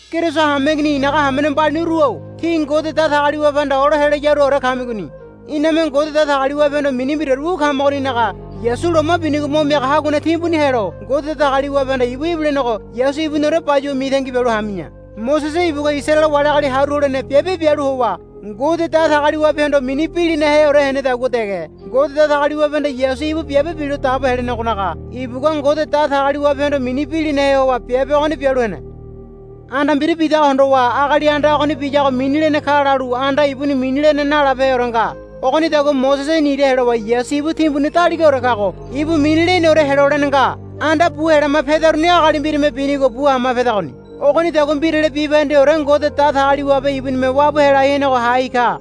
Keriso hameigini i̱naga hamene mbaliniru-o tí Ngode Datagaliwabehanda olo helayaruore kamigoni. Iname Ngode Datagaliwabehondo mini mbiraore wu kamagoninaga Yasu loma binigo mo miaga haguane timbuni helo Ngode Datagaliwabehanda ibu ibilenego Yasu ibuniore bayuwa mitangi bialu hami̱ya. Mosese ibugua Isaraele wali agali haru holene biabe bialu howa Ngode Datagaliwabehondo mini bilinaheore henedagua dege Ngode Datagaliwabehanda Yasu ibu biabe bilo dabo helenegonaga ibugua Ngode Datagaliwabehondo mini bilinahe howa biabe ogoni bialu hene. Anda mbira bidago hondowa agali anda ogoni biyago mini lene ka lalu anda ibuni mini lene nalabeheore nga. Ogonidagua Mosese nira helowa Yasu ibu timbuni daligaore kago ibu mini leneore helolene nga. Anda bu helama pedaruni agali mbirame binigo bu hama pedagoni. Ogonidagua mbirale bibahendeore Ngode Datagaliwabe ibunime wabu helai henego hai ka.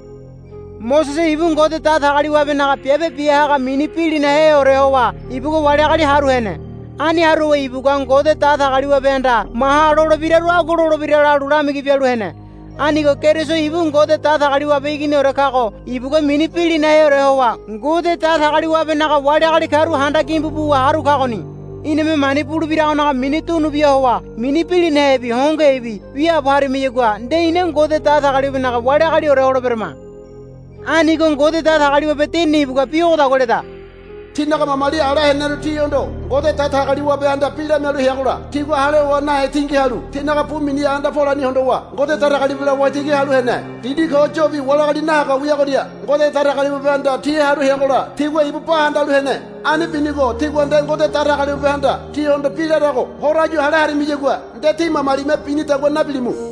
Mosese ibu Ngode Datagaliwabenaga biabe biahaga mini bilinaheore howa ibugua wali agali haru hene. Ani haru howa ibugua Ngode Datagaliwabehanda maha lolebiraru agua lolebira lalu lamigi bialu hene. Anigo Keriso ibu Ngode Datagaliwabe Iginiore kago ibugua mini bilinaheore howa Ngode Datagaliwabenaga wali agali karu handa gimbu buwa haru kagoni. Iname mani bulebiragonaga mini dunubia howa mini bilinahebi hongohebi wiaabo harimayagua nde ina Ngode Datagaliwabenaga wali agaliore holeberama. Anigo Ngode Datagaliwabe Dinini ibugua bi ogodagua leda, Tínaga mamali ala heneru tihondo Ngode Datagaliwabehanda bi lamialu heagola tigua hale howa nahe tingi halu tinaga bu miniha anda polani hondowa Ngode Datagaliwabela waitigi halu hene. Dindi ko yobi wali agali nahaga wiagoria Ngode Datagaliwabehanda ti haru heagola tigua ibu ba handalu hene. Ani binigo tígua nde Ngode Datagaliwabehanda tíhondo bi larago horo áyu hale harimiyagua nde tí mamalime binidagua nabilimu.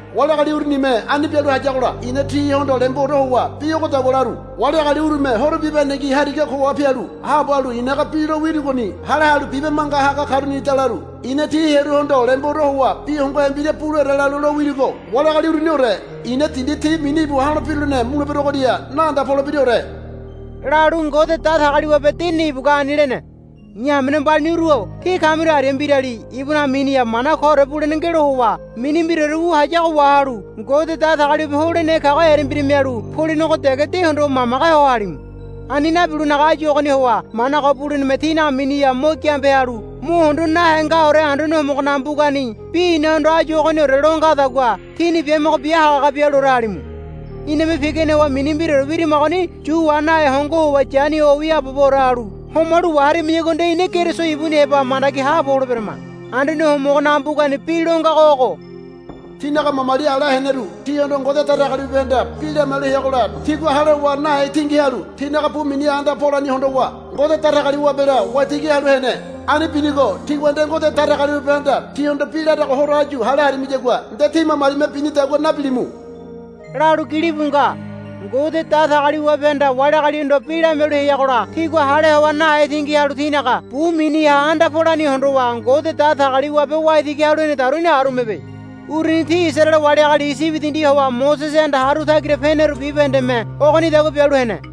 Wali agali urunime ani bialu hayagola i̱na tihondo lemboore howa bi ogodagua laru, Wali agali urume horo bibahendengi hariga koha pialu haabo halu i̱naga bi lo wirugoni hale halu bibe manga haga karunida, laru. I̱na ti hearuhondo lemboore howa bi hongohe mbira buleore lalu lowirugo, Wali agali uruniore i̱na dindi ti mini íbu ha̱lo birulene muleberogoria naanda polebiraore, lalu Ngode Datagaliwabe Dinini ibugua ani lene. I̱ hamene mbaliniru-o tí kamiru aria mbirali ibunaga miniha mana koore bulene ngelo howa mini mbiraore wu hayago wahalu Ngode Datagaliwabe holenehe kago erembira mialu polenego dege de hondowa mamage ho halimu. Ani nabilonaga áyu ogoni howa mana ko buleneme tínaga miniha mo giambe halu mo hondo nahe ngaore Anduane Homogonaga mbugani bi inahondo, Áyu ogoniore, lo ngadagua tíni biamogo bia hagahaga bialuore halimu. Iname pigane howa mini mbiraore wirimagoni yu wa nahe hongo howa yani ho wiaaboore halu homalu waharimayagua nde ina Keriso ibuni heba mandagi haabo holeberama. Anduane Homogonaga mbugani bi lo ngago ogo, Tínaga mamali ala heneru tihondo Ngode Datagaliwabehanda bi lamialu heagola tigua hale howa nahe tingi halu tinaga bu miniha anda polani hondowa Ngode Datagaliwabela waitigi halu hene. Ani binigo tígua nde Ngode Datagaliwabehanda tíhondo bi larago horo áyu hale harimiyagua nde tí mamalime binidagua nabilimu, lalu gilibu nga. Ngode Datagaliwabehanda wali agalihondo bi lamialu heagola tigua hale howa nahe tingi halu tinaga bu miniha anda polani hondowa Ngode Datagaliwabe waitigi halu henedaruni arumebe. Uruni ti Isaraele wali agali Iyibi dindi howa Mosesehanda haru tagira peneru bibahendeme ogonidagua bialu hene.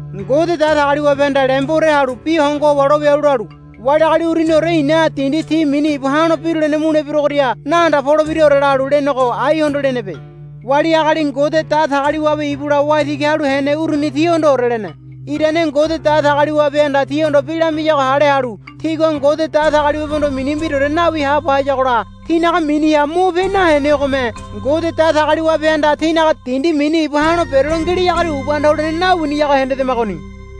Ngode Datagaliwabehanda lemboore halu bi hongo howa lo wialu lalu, Wali agali uruniore i̱na dindi ti mini íbu ha̱lo birulene muleberogoria naanda polebiraore, lalu lenego aihondo lenebe. Wali agali Ngode Datagaliwabe ibula waitigi halu hene uruni tihondoore lene. Irane Ngode Datagaliwabehanda tihondo bi lamiyago hale halu tigua Ngode Datagaliwabehondo mini mbiraore nawi haabo hayagola tinaga miniha mo pe nahenegome Ngode Datagaliwabehanda tinaga dindi mini íbu ha̱lo berelo ngeleagoria ubanda holene nawiniyago hendedamagoni.